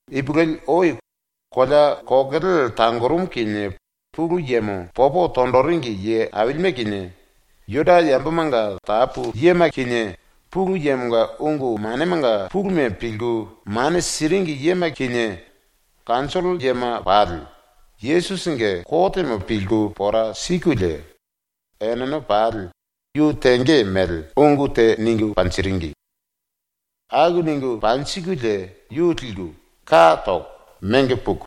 Ipulueli ou kolea kokele tangorumu kinie Pulu Yemo popo tonjiringi ye ailime kinie, Juda yambomanga tapu yema kinie, Pulu Yemonga ungu manemanga puluma pilku mane siringi yema kinie, kanjollo yema pali, ⸤Yesusinge kotemo pilku pora sikulie⸥ enene pali ⸤yu tenge mele⸥ ungu te ningu panjiringi. Aku ningu panjikulie yu liku, ka toko, mengo puku,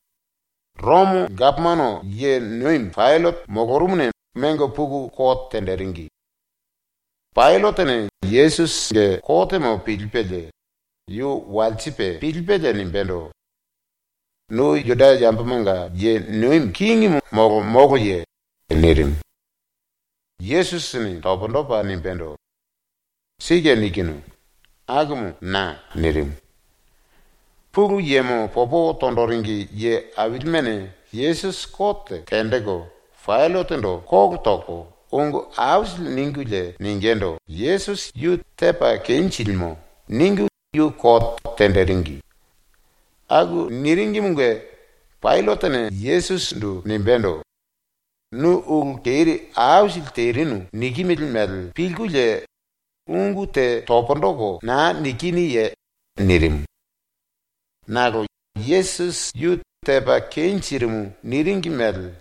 ⸤Romo gapomano ye nomi⸥ Paillate molorumuna mengo puku kote tenjiringi. Paillatene ⸤Yesusinge kotemo pilipelie⸥ yu walsipe pilipelie nimbendo: “Nu Juda yambomanga ye nomi kingimu molo moloye?” nirimu. Yesusini pundu topa nimbendo: “Sike nikinu. Akumu na.” nirimu. Pulu Yemo popo tonjiringi ye ailimene Yesusi kote tenjiku Paillatendo ⸤kolo toko⸥ ungu aisili ningulie ningindu “Yesusi yu tepa kenjilimo.” ningu yu kote tenjiringi. Aku niringimunge Paillatene Yesusindu nimbendo: “Nu ulu keri aisili terinu nikimili mele pilkulie ungu te pundu toko naa nikinuye?” nirimu. Nakolo Yesusi ⸤yu tepa kenjirimu niringi mele⸥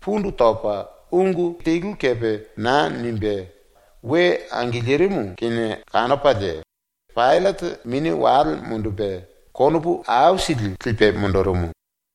pundu topa ungu telu kepe naa nimbe ⸤karaye naa tepa we angilirimu kinie kanopalie⸥ Paillate mini wale mundupe konopu aisili lipe mundurumu.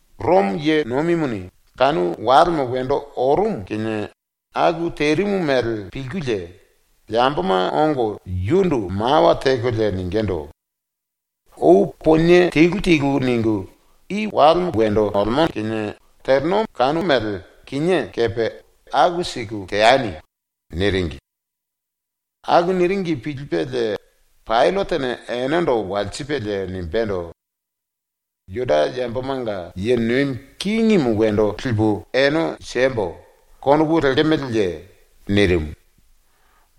⸤Romo ye nomimuni kanu walemo wendo orumu kinie aku terimu mele pilkulie⸥ yamboma ongo yundu mawa tekolie ningindu: “Ou ponie telu telu ningu i walemo kinie teleno mele kinié kepe aku siku teani.” niringi. Aku niringi pilipelie Paillatene enendo walsipelie nimbendo: “‘Juda yambomanga ye nomi kingimu wendo lipu ene siembo.’ konopu lekemeleye?” nirimu.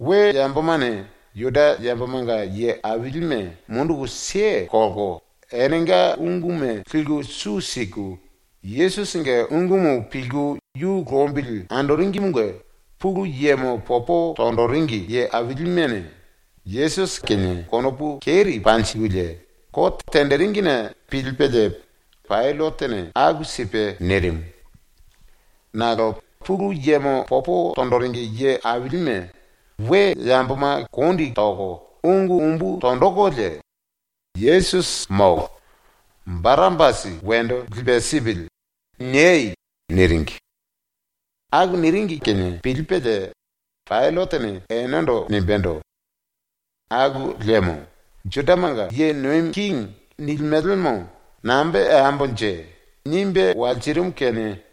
⸤We yambomane Juda yambomanga ye ailime munduku kelko enenga unguma liku su siku Yesusinge ungumu pilku yu lombili andoringimunge⸥ Pulu Yemo popo tonjiringi ye ailimene Yesusi kinie konopu keri panjikulie kote tenjiringine pilipelie Paillatene aku sipe nirimu. Nakolo Pulu Yemo popo tonjiringi ye ailime we yamboma kondi toko ungu umbu tonjikulie “ “Yesusi molo. Barapasi wendo lipe sipili.” niei!” niringi. Aku niringi kinie pilipelie Paillatene enendo nimbendo: “Aku liemo ‘Judamanga ye nomi kingi’ nilimelemo nambe teambonje.” nimbe walsirimu kinie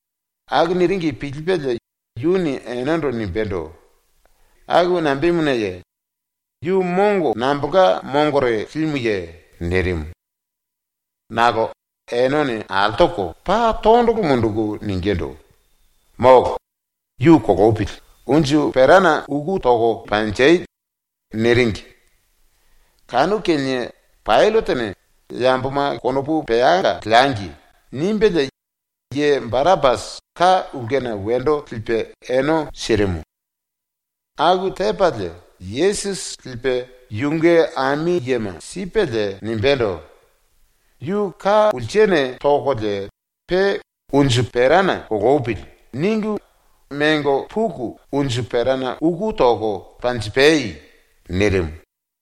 Aku niringi pilipelie yuni enendo nimbendo: “Aku nambemunaye? Yu mongo nambolka mongore limuye?” nirimu. Nakolo enene ⸤altoko⸥ paa tondolo munduku ningindu: “Molo! Yu kolopili, unju perana uku toko panji!” niringi. Kanu kinie Paillatene ‘Na kinie konopu peanga leangi.’ nimbelie ye Barapasi ka ulkena wendo lipe ene sirimu. ⸤Aku tepalie⸥ Yesusi lipe ⸤yunge ami yema⸥ sipelie nimbendo: “Yu ka pulsene tokolie pe ‘Unju perana kolopili.’ ningu mengo puku unju perana uku toko panjipai.” nirimu.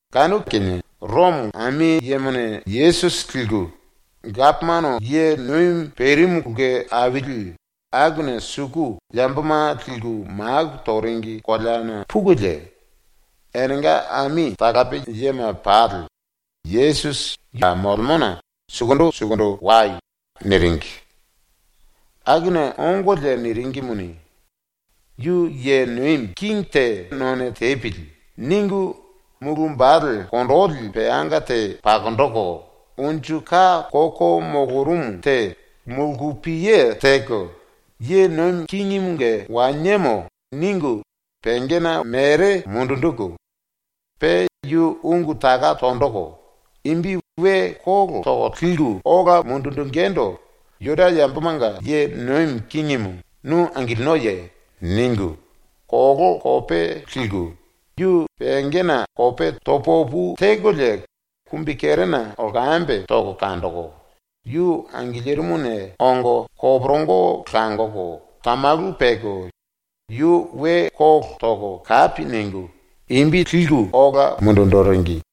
Kanu kinie ⸤Romo⸥ ami yemane Yesusi liku gapomano ye nomimu perimu ulke aili akuna suku yamboma liku maku toringi koleana pukulie, enenga ami talape yema pali “⸤Yesusi ya molemona⸥ sukundu sukundu wai.” niringi. Akuna ongolie niringimuni ⸤‘Yu ye nomi kingi te none tepili.’ ningu⸥ mulu wambale kondoli peanga te pakonjiku unju ka koko molorumu te mulkupiye teko ‘Ye nomi kingimunge waniemo.’ ningu pengena mere mundunjiku, pe yu ⸤ungu taka tonjiku⸥ imbi we kólo toko ambolko ola linjingindu “Juda yambomanga ye nomi kingimu, nu angilinoye?” ningu ⸤koló kope liku⸥ yu pengena kope to pu opu tekolie kumbikerena lkambe toko kanjiku, yu angilirimuna ongo koporongo langoko tamalu peko yu we kólo toko kapi ningu imbi ambolko ola linjiringi.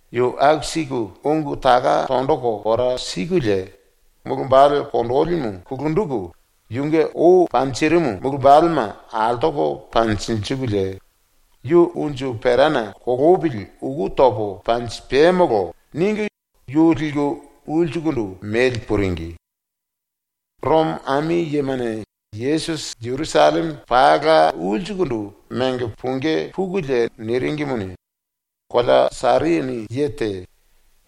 Yu aku siku ungu taka tonjiku pora sikulie mulu wambale kondolimu kulunjiku yunge ou panjirimu mulu wambalema altoko panjinjikulie “Yu unju perana kolopili uku topo panjipamolo.” ningu yu liku ulsukundu mengo puringi. ⸤Romo ami yemane Yesusi Jerusalleme pala ulsukundu mengo pungí pukulie niringimuni,⸥ kolea Sairini ye te,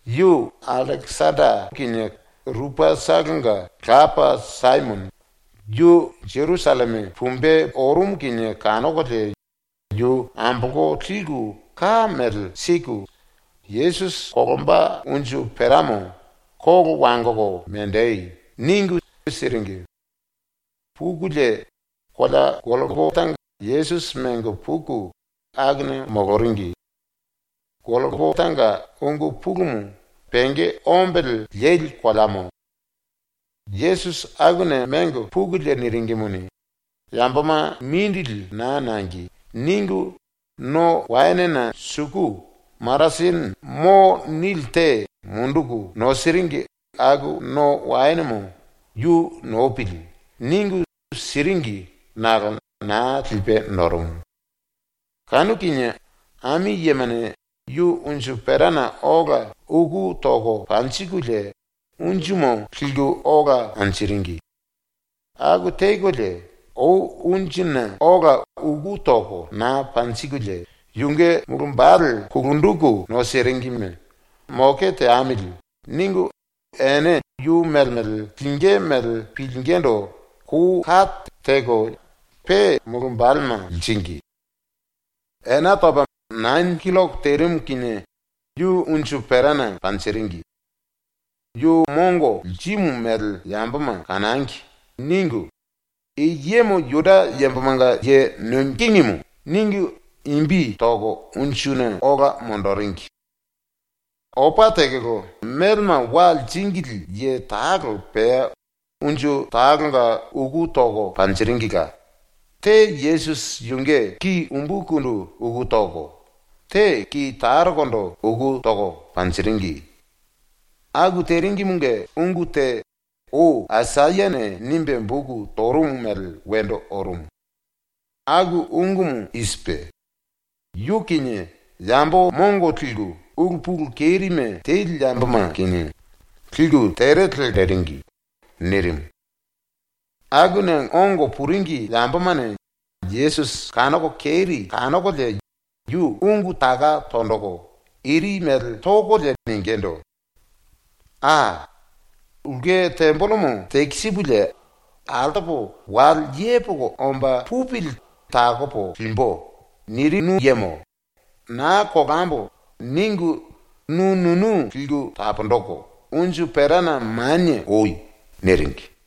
yu Allekesanda kinie Rupasitolonga lapa Saimono, yu Jerusalleme pumbe orumu kinie kanokolie yu ambolko liku ka mele siku Yesusi kolomba unju peramo “Kolo wangoko menji!” ningu siringi. Pukulie kolea Golkota Yesusi mengo puku akuna moloringi. (Golkotanga ungu pulumu ‘penge ombele leli koleamo’.) ⸤Yesusi akuna mengo pukulie niringimuni, ‘Yamboma mindili naa nangi.’ ningu⸥ no waenena suku maratene ‘mo’ nili te munduku nosiringi aku no waenemo ‘Yu nopili.’ ningu, siringi nakolo naa lipe norumu. Kanu kinie ⸤ami yemane⸥ yu unju perana ola uku toko panjikulie unjumu liku ola anjiringi. ⸤Aku tekolie, ou unjuna ola uku toko naa panjikulie⸥ yunge mulu wambale ⸤kulunjiku nosiringime⸥ ‘Moke teamili.’ ningu ene yu mele mele lingí mele pilingindu kou kate teko pe mulu wambalema liringi. Ena topa nane killoko terimu kinie yu unju perana panjiringi. ‘Yu mongo lirimu mele yamboma kanangi.’ ningu I YEMO JUDA YAMBOMANGA YE NOMI KINGIMU ningu imbi toko unjuna ola monjiringi. Opa tekolo melema wa liringili ye talo pea unju talonga uku toko panjiringila. Te Yesusi yunge ki umbukundu uku toko, te ki tarokondo uku toko panjiringi. (Aku teringimunge ungu te ou Aisayane nimbe boku torumu mele wendo orumu. Aku ungumu i sipe: “Yu kinie yambo mongo liku ulu pulu kerime teli yamboma kinie liku tere lelko mako toringi.” nirimu.) Akuna ongo puringi yambomane Yesusi ⸤kanoko keri kanokolie yu⸥ ungu taka tonjiku iri mele tokolie ningindu: “Aa! “Ulke tembelemo tekisipulie altopo wale yepoko omba pupili takopo limbu.” nirinu yemo, ‘Naa kolambo.’ ningu nu nunu liku taponjiku unju perana manie oi.” niringi.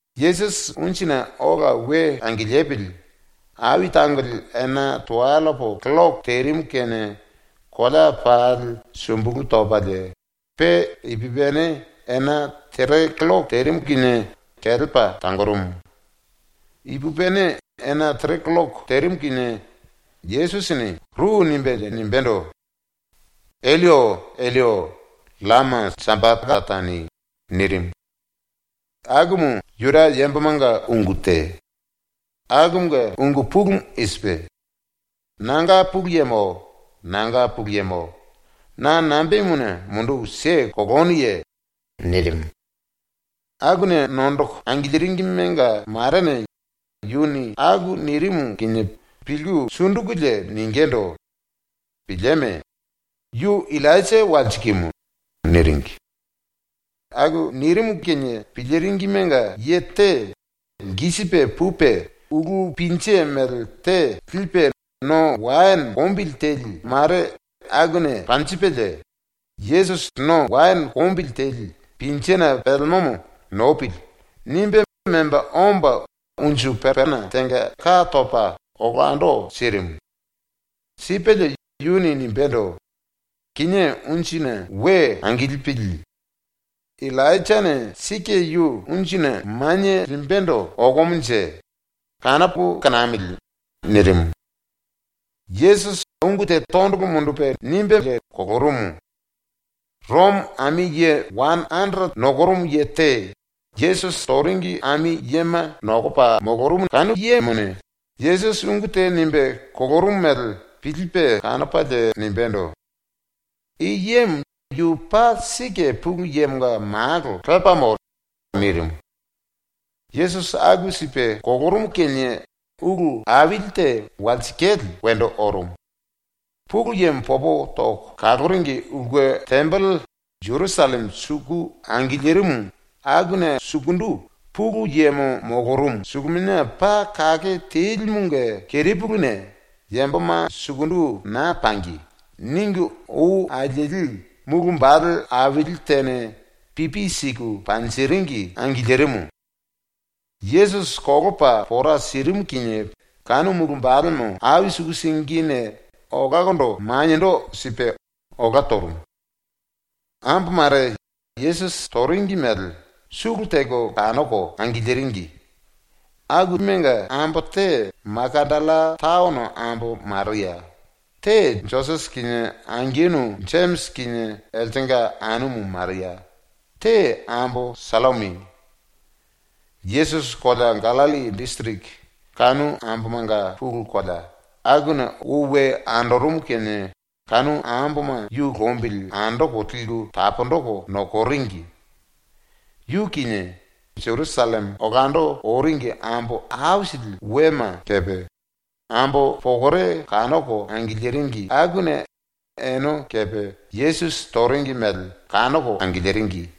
⸤Yesusi unjuna ola we angilipili⸥ ai tangoli ena tuwellepo killoko terimu kinie kolea pali sumbulu topalie, pe ipupini ena tere killoko terimu kinie kelepa tangorumu. Ipupini ena tere killoko terimu kinie Yesusini ru nimbelie nimbendo: “Elloi, Elloi, llama sapakatani.” nirimu. Akumu Juda yambomanga ungu te. Akumunge ungu pulumu i sipe: “Nanga Pulu Yemo, nanga Pulu Yemo, na nambemuna munduku kelenuye?” nirimu. Akuna nondoko angiliringimenga marene yuni aku nirimu kinie pilku ⸤sundukulie⸥ ningindu: “Pilieme! Yu Illainja walsikimu.” niringi. Aku nirimu kinie piliringimenga ye te lkisipe pupe ulú pinje mele te lipe no waene kombili teli mare akuna panjipelie, ‘Yesusi no waene kombili teli pinjena pelemomo nopili.’ nimbe memba omba unju pepena tenga ka topa olando sirimu. Sipelie yuni nimbendo: “Kinié unjuna we angilipili. Illainjane sike yu ⸤unjuna⸥ manie limbendo okomonje, kanopo kanamili.” nirimu. Yesusi ungu te tondolo mundupe nimbelie kolorumu. ⸤Romo⸥ ami ye wane anderete nokorumu ye te Yesusi toringi ami yema nokopa molorumu kanu yemone Yesusi ungu te nimbe kolorumu mele pilipe kanopalie nimbendo: “I yemo yu paa sike Pulu Yemonga malo lepamo.” nirimu. ⸤Yesusi aku sipe kolorumu kinie ulu aili te walsikale wendo orumu.⸥ Pulu Yemo popo toko kaloringi ulke tembele ⸤Jerusalleme suku angilirimu akuna sukundu Pulu Yemo molorumu⸥ Suluminia Paa Kake Telimunge kerepuluna ⸤‘Yamboma sukundu naa pangi.’ ningu ou alieli⸥ mulu wambale aili tene pipi siku panjiringi angilirimu. ⸤Yesusi kolopa pora sirimu kinie⸥ kanu mulu wambalemo ai suku singine olakondo maniendo sipe olá torumu. Ambo mare ⸤Yesusi toringi mele⸥ sulu teko kanoko angiliringi. Enenga ambo te Makatalla taono ambo Maria, te Josese kinie angenu Jemisi kinie eltenga anumu Maria, te ambo Sallomi. Yesusi kolea Gallilli disiriki, ⸤kanu ambomanga pulu kolea,⸥ akuna ou we andorumu kinie kanu amboma yu lombili andoko liku taponjiku nokoringi. Yu kinie, Jerusalleme olando oringi ambo aisili wema kepe, ambo pokore kanoko angiliringi akuna ene kepe ⸤Yesusi toringi mele⸥ kanoko angiliringi.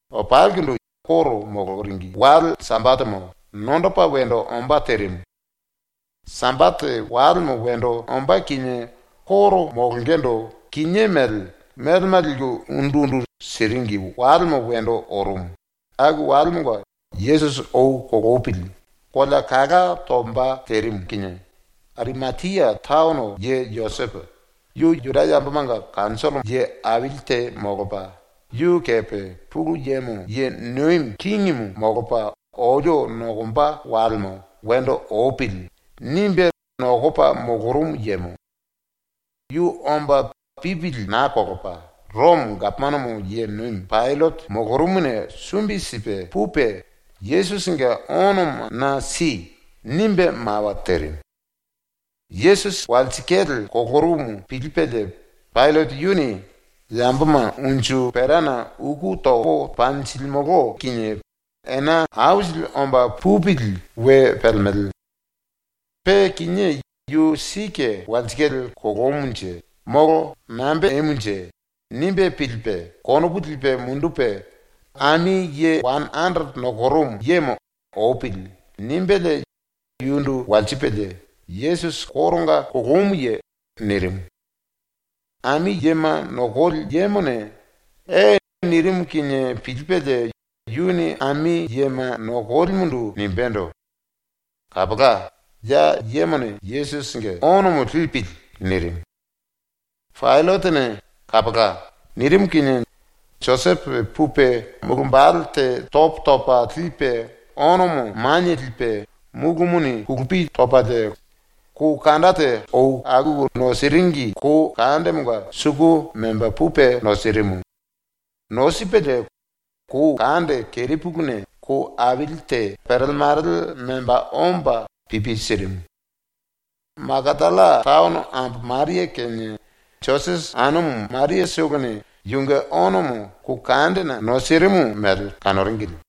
Opalikundu ⸤Juda yambomanga koro moloringi⸥ wale Sambatemo nondopa wendo ombá terimu. Sambate walemo wendo ombá kinie koro molongendo kinié mele melema liku undu undu siringi walemo wendo orumu, aku walemonga ⸤Yesusi ou kolopili⸥ kolea kala tomba terimu kinie, Arimatia taono ye Josepo, yu Juda yambomanga kanjollo ye aili te molopa, yu kepe ‘Pulu Yemo ye nomi kingimu molopa olio nokomba walemo wendo opili.’ nimbe nokopa molorumu yemo. Yu omba pipili naa kolopa ⸤Romo gapomano ye nomi⸥ Paillate molorumuna sumbi sipe pupe “Yesusinge onomo na si.” nimbe mawa terimu. Yesusi walsikale kolorumu pilipelie Paillate yuni ⸤‘Yamboma unju perana uku topo panjilimolo kinie ena aisili omba pupili we pelemele. Pe kinié yu sike walsikale kolomunje molo nambe temunje?’ nimbe pilipe⸥ konopu lipe mundupe ami ye wane anderete nokorumu yemo “Opili.” nimbelie yundu walsipelie “Yesusi koronga kolomuye?” nirimu. Ami yema nokoli yemone “E.” nirimu kinie pilipelie yuni ami yema nokolimundu nimbendo: “Kapola, ya yemone ⸤Yesusinge⸥ onomo lipili.” nirimu. ⸤Paillatene “Kapola.” nirimu kinie⸥ Josepo pupe mulu wambale te topo topa lipe onomo manie lipe, múlumuni kulupi topalie kou kande te akuku nosiringi kou kandemonga suku memba pupe nosirimu. Nosipelie kou kande kerepuluna kou aili te perele marele memba omba pipi sirimu. Makatalla taono ambo Maria kinie Josese anumu Mariatolone yunge onomo ⸤kou kandena⸥ nosirimu mele kanoringili.